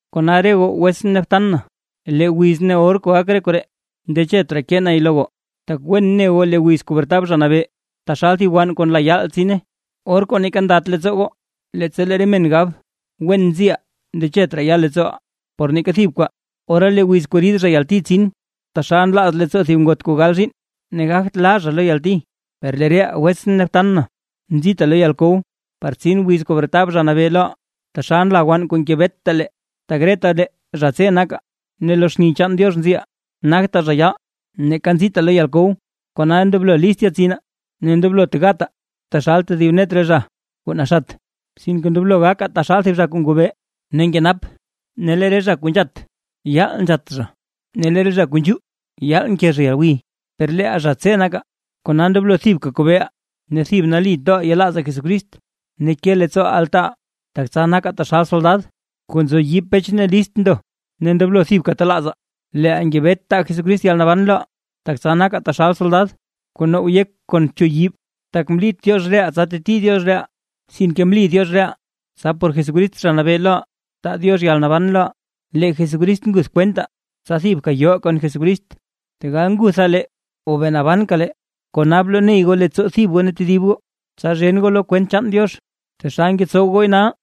Kona re goo wetsʼn ne btan na, lee wiz ne or kuu gak re koree ndechet raa kee nay lo goo, tak wen ne goo lee wiz kuu bretab Zha Nabee, taxal thib wann kuu nla yaal tsine, or kuu neeka ndate leettsoo goo. Leettsa lee re men gab: “Wen nziʼaa ndechet raa ya leettsooʼaa por neeka thib kwaa”, ora lee wiz kuu rid zha yalti tsin, taxal nlaaz leettsoo thib ngot kuu gal zhiinn, ne gagt laa zha lo yalti. Per lee reʼaa wetsʼn ne btan na, nzitaa lo yalkow par tsin wiz kuu bretab Zha Nabee loʼaa taxal nla wann kuu ngebeta lee. Tak retalee zha tse nakaa ne lo xni chaan Diox nziʼaa, nagtaa zha yaal ne neeka nzitaa lo yalkow. Kona ndoblo list yetsinaa ne ndoblot gataa taxal tedib net re zha kuu naxat, sinke ndoblo gakaa taxal thib zha kuu ngobee ne nkenap. Tak lee re zha kuu nzhat, yaal nzhat zha, ne lee re zha kuu nzhuu yaal nke zha yalgwiy. Per leeʼaa zha tse nakaa; kona ndoblo thibka kobeeʼaa ne thib nali toʼaa yelaazaa Jesucrist ne ke leettsoo altaaʼaa, tak tsa nakaa taxal soldad kuu nzo yiib pech ne list ndo. Ne ndoblo thibka telaazaa leeʼaa ngebetaa taa Jesucrist yalnaban loʼaa, tak tsa nakaa taxal soldad kuu now yek kon bchuyib. Tak mlit Diox reʼaa tsa teti Diox reʼaa, sinke mli Diox reʼaa tsa por Jesucrist Zha Nabee loʼaa taa Diox yalnaban loʼaa. Lee Jesucrist nguth kwentaa tsa thibka yoʼaa kon Jesucrist, tegal ngutha lee o bee nabanka lee. Kona bloney goo leettsoo thib goo ne tedib goo, tsa zhen goo lo kwent chaan Diox, taxal ngetsowa gooy nal.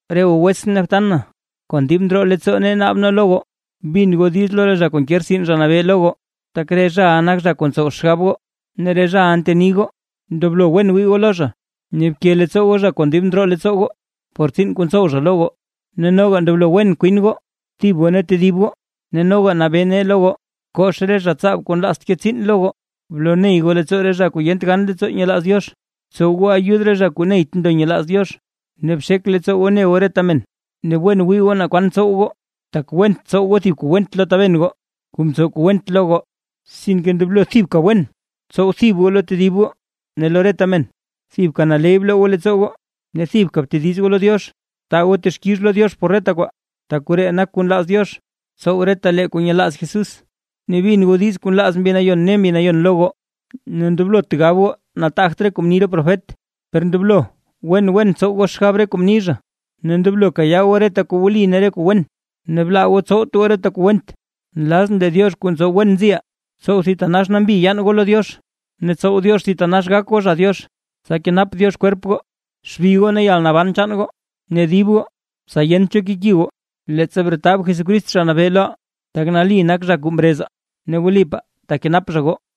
Re goo wetsʼn ne btan na, kon dib ndroo leettsoo nee naab nee lo goo, bin goo diiz lo re zha kuu nke rtsin Zha Nabee lo goo, tak re zhaʼa nak zha kuu ntsow xgab goo ne re zhaʼa nteni goo. Ndoblo wen wii goo lo zha ne bke leettsoo goo zha kon dib ndroo leettsoo goo, por tsiin kuu ntsow zha lo goo. Ne noga ndoblo wen kwin goo thib goo ne tedib goo. Ne noga nabee nee lo goo, kox re zha tsaab kuu nlaazt ke tsiin lo goo, bloney goo leettsoo re zha kuu yent gan leettsoo nyelaaz Diox, btsow goo ayud re zha kuu neyt ndo nyelaaz Diox, ne bxek leettsoo goo bne goo reta men. Ne wen wii goo naa kwan tsow goo, tak went tsow goo kuu went lo thib taben goo kuu mtsow kuu went lo goo, sinke ndoblo thibka wen tsow thib goo lo tedib goo ne lo reta men. Thibka naley bloo goo leettsoo goo. Ne thibka btediz goo lo Diox. Taa goo texkix lo Diox por reta kwaa, tak koree nak kuu nlaaz Diox tsow retalee kuu nyelaaz Jesús. Ne bin goo diiz kuu nlaaz Mbi Nayon ne Mbi Nayon lo goo. Ne ndoblot gab goo nataagt re kuu mni re profet, per ndoblo wen wen tsow goo xgab re kuu mni zha, ne ndoblo kayaa goo reta kuu wli ne re kuu wen, ne blaa goo tsowt goo reta kuu went. Nlazʼn lee Diox kuu ntsow wen nziʼaa, tsow thitanax nambi yaan goo lo Diox ne tsow Diox thitanax gak goo zha Diox, tsa kenap Diox kwerp goo, xbi goo ne yalnaban chaan goo ne dib goo, tsa yent cho keki goo, leettsa bretab Jesucrist, Zha Nabee loʼaa. Tak nali nak zha kuu mrezaa ne wlipaa tekenap zha goo.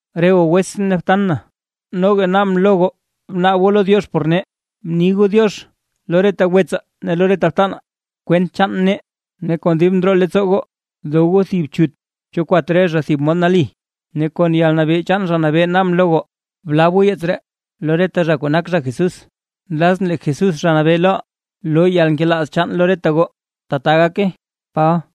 Re goo wetsʼn ne btan na, noga naabʼn lo goo bnaab goo lo Diox por nee. Bni goo “diox” lo reta wetsaa ne lo re btanaa kwent chaan nee; ne kon dib ndroo leettsoo goo dow goo thib chut cho kwat re zha thib mod nali. Ne kon yalnabee chaan Zha Nabee naabʼn lo goo, blab goo yeets ree lo reta zha kuu nak zha Jesús. Nlazʼn lee Jesús Zha Nabee loʼaa loo yalnkelaaz chaan lo reta goo. ¡Tbaa gake! Paba